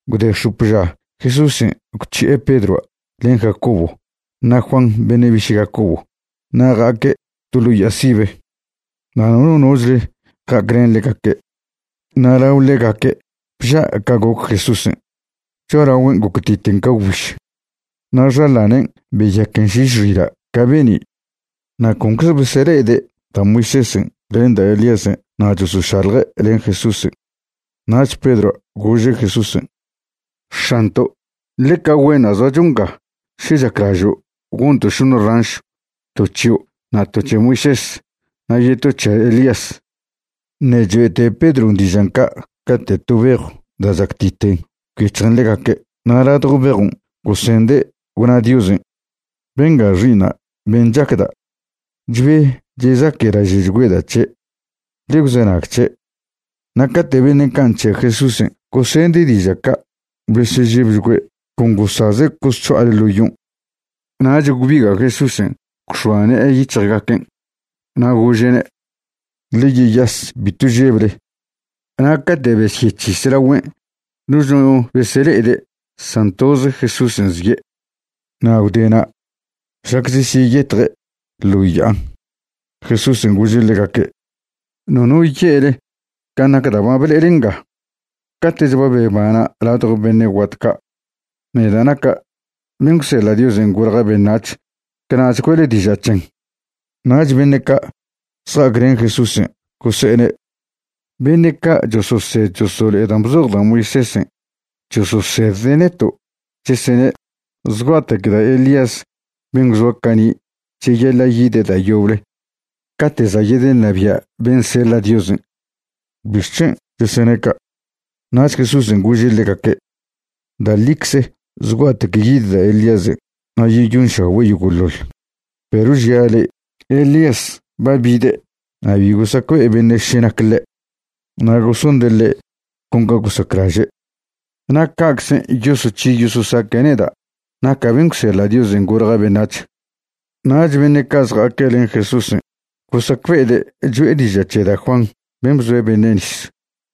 Gwde x̱op ža Jesúsen' gwc̱hi'e Pedroa' len Jacobo na' Juan beṉe' biše' Jacobo na' ja'aque' to ḻo ya'a sibe. Na' nono nochle ja'aclen ḻegaque'. Na' lao ḻegaque' bža' ca goc Jesúsen', cho'alagüen' goctiten ca gwbiž, na' xaḻanen' beyaquen šiš xila' ca be'ni'. Na' concze besele'ede' da' Moisésen' len da' Elíasen' na' chosošalje' len Jesúsen'. Nach Pedroa' gože' Jesúsen': ―¡X̱anto', ḻeca güenṉa' zoacho nga! Še chaclažo', gonto' šoṉe ranšw, to c̱hio', na' to c̱he Moisés, na' yeto c̱he Elías. Ṉe' choe'te Pedron' dižan' ca' cate' to bejw da' chactiten gwyec̱hjen ḻegaque' na' ladjo bejon' gosende' gwna Diosen': ―Benga Xi'iṉa' ben' chacda'. Chbe chezaquelaže'chgüeda' c̱he'. Ḻe gwzenag c̱he'. Na' cate' beṉe' ca' nc̱he'e Jesúsen' gosende' diža' ca' besežebchgüe', con gosaze' cosc̱ho'ale ḻo yon'. Nach gwbiga' Jesúsen' gwx̱oa ṉe'e yic̱hjgaquen' na' gože'ne': ―Ḻe yeyas. Bitw žeble. Na' cate' besyec̱his lagüen', noch no besele'ede' san toze Jesúsen' zie'. Na' gwde na' šlac chesyeyetje' ḻo ya'an Jesúsen' gože' ḻegaque': ―Nono ye'le can' nac dan' ba ble'ele nga. Cate'ch ba bebana' ladjo beṉe' guat ca', neda' naca' ben' gwseḻa' Diosen' golja' beṉac̱h, cana'ch güe'le diža' c̱hen. Nach beṉe' ca' zja'aclen Jesúsen' gose'ene': ―Beṉe' ca' chososed chosolo'e dan' bzoj da' Moisésen' chososedde' neto' chesene' zgua'tec da' Elías ben' gwzoa cani' cheyaḻa' yide' da' yoble cate' za' yedeṉabia' ben' seḻa' Diosen'. ¿Bixc̱hen' chesene' ca'? Nach Jesúsen' gože' ḻegaque': ―Da' ḻicze zgua'tec yid da' Elíasen' na' yeyonšagüe' yogo'ḻoḻ. Perw žia' le'e, Elías ba bide' na' bi gosacbe'e beṉe' še nac ḻe'. Na' gosonde' ḻe' con ca gosaclaže'. Na' ca'czen' yosoc̱hi yososaque' neda' naca' ben' gwseḻa' Diosen' golja' beṉac̱h. Nach beṉe' ca' zja'aque' len Jesúsen' gosacbe'ede' cho'e diža' c̱he da' Juan ben' bzoe' beṉe' nis.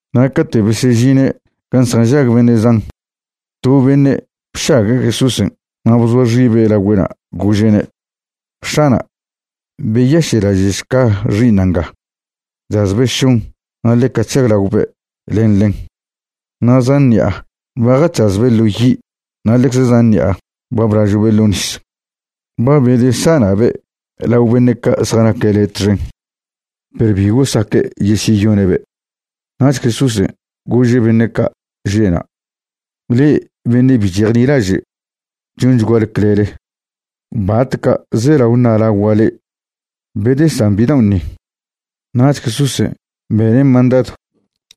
Na' cate' besežine' gan' zjanžag beṉe' zan, to beṉe' bšague' Jesúsen' na' bzoa xibe' lagüe'na' gože'ne': ―X̱ana', beyaše'laže'šca xi'iṉa' nga. Chazbe' šon na' ḻeca chžaglaobe' len ḻen. Na' zan ṉi'a ba jac̱hazbe' ḻo yi' na' ḻecze zan ṉi'a ba blažo'be' ḻo nis. Ba bedesana'be' lao beṉe' ca' zjanaque' le' txen, perw bitw gosaque' yesyeyone'be'. Nach Jesúsen' gože' beṉe' ca' že'na': ―¡Le'e beṉe' bi chejnilaže', chonchguale clele! ¿Batca' zelao ṉa'lagua' le'e? Bedesan bidaon' ni. Nach Jesúsen' bene' mandadw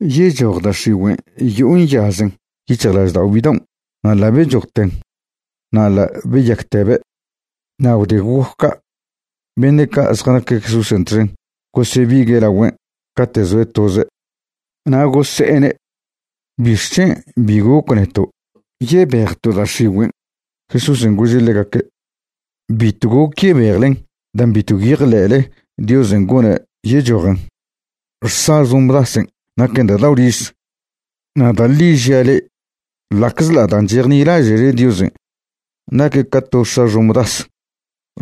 yechoj da' x̱igüen' yo'o nyazen yic̱hjlaždao' bidaon' na' ḻa' bechojten. Na' ḻa' beyaquetebe'. Na' gwde goc ca', beṉe' ca' zjanaque' Jesúsen' txen gosebigue' lagüen' cate' zoe' toze', na' gose'ene': ―¿Bixc̱hen' bi goc neto' yebejto' da' x̱igüen'? Jesúsen' gože' ḻegaque': ―Bitw goc yebejlen dan' bitw gwyejḻe'le Diosen' gone' yechojen. Xsa xomdasen' naquen da' dao' riz. Na' da' ḻi žia' le'e, ḻa'czḻa' dan' chejnilaže'le Diosen' naquen ca to xsa xomdas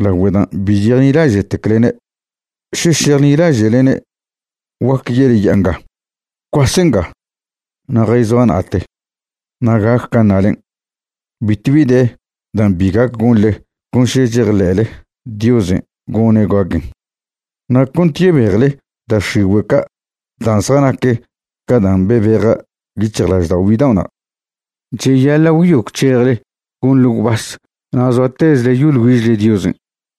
lagüe dan' bi chejnilaže'teclene', še šejnilaže'lne', guaque ye'le ya'a nga: “Gwcuas nga, na' jayzoa na'ate”, na' gac can' ṉalen'. Bitw bi de dan' bi gac gonḻe con še chejḻe'le Diosen' gone' gaquen. Na' cont yebejle da' x̱igüe' ca' dan' zjanac ca dan' bebeja' yic̱hjlaždao' bidao'na', cheyaḻa' gwyo gwc̱hejle gonḻe gwbas na' zoatezle yoḻ güižle Diosen'.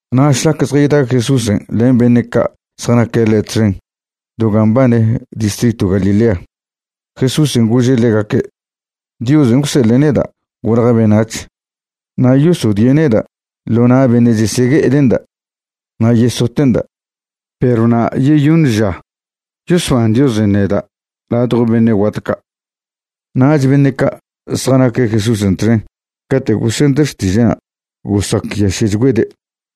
Na' šlac zjayda Jesúsen' len beṉe' ca' zjanaque' ḻe' txen do gan' mbane distritw Galilea, Jesúsen' gože' ḻegaque': ―Diosen' gwseḻe' neda' golja' beṉac̱h, na' yosodie' neda' ḻo na' beṉe' chesegue'ede'nda', na' yesote'nda'. Perw na' yeyoṉ ža yosban Diosen' neda' ladjo beṉe' guat ca'. Nach beṉe' ca' zjanaque' Jesúsen' txen cate' gosende' xtiže'na' gosacyaše'chgüede'.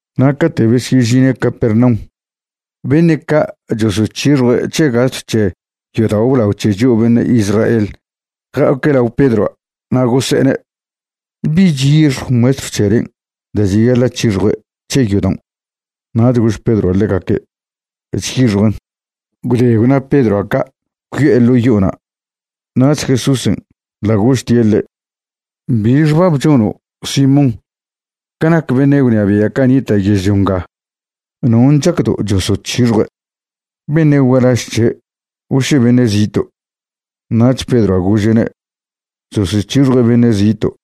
Na' cate' besyežine' Capernaum, beṉe' ca' chosoc̱hixjue' c̱he gastw c̱he yodao' blao c̱he chio' beṉe' Israel ja'aque' lao Pedroa'. Na' gose'ene': ―¿Bi chyixjw maestrw c̱helen' da' cheyaḻa' c̱hixjue' c̱he yodaon'? Nach gož Pedroa' ḻegaque': ―Chyixjuen'. Gwde gwna Pedroa' ca' gwyo'e ḻo' yo'ona'. Nach Jesúsen' ḻa' gožtie' ḻe': ―¿Bi xbab chono', Simón? Ca nac beṉe' gwnabia' ca' nita' yežlio nga, ¿non' chacdo' chosoc̱hixjue'? ¿beṉe' gualaž c̱he' o še beṉe' zito'? Nach Pedroa' gože'ne': ―Chosoc̱hixjue' beṉe' zito'.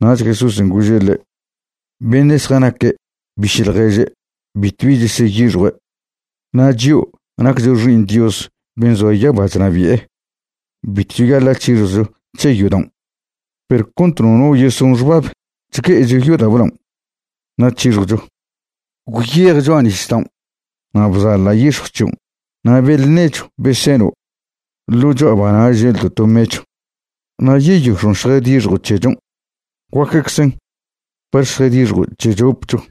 Nach Jesúsen' gože' ḻe': ―Beṉe' zjanaque' biše' ḻježe' bitwbi cheseyixjue'. Na' chio' naccho xi'iṉ Dios ben' zoa yaba chnabi'e, bitw cheyaḻa' c̱hixjwcho c̱he yodaon'. Perw cont nono yeson xbab chgue'echo yodao' blaon', na' c̱hixjwcho. Gwyej cho'a nisdaon', na' bzaḻa' yix̱jw c̱hion' na' beḻ nechw be seno', ḻo cho'aba'na' želdo' to mechw. Na' yeyox̱on' šjadixjo' c̱hechon'. Guaqueczen par šjadixjo' c̱he c̱hopcho.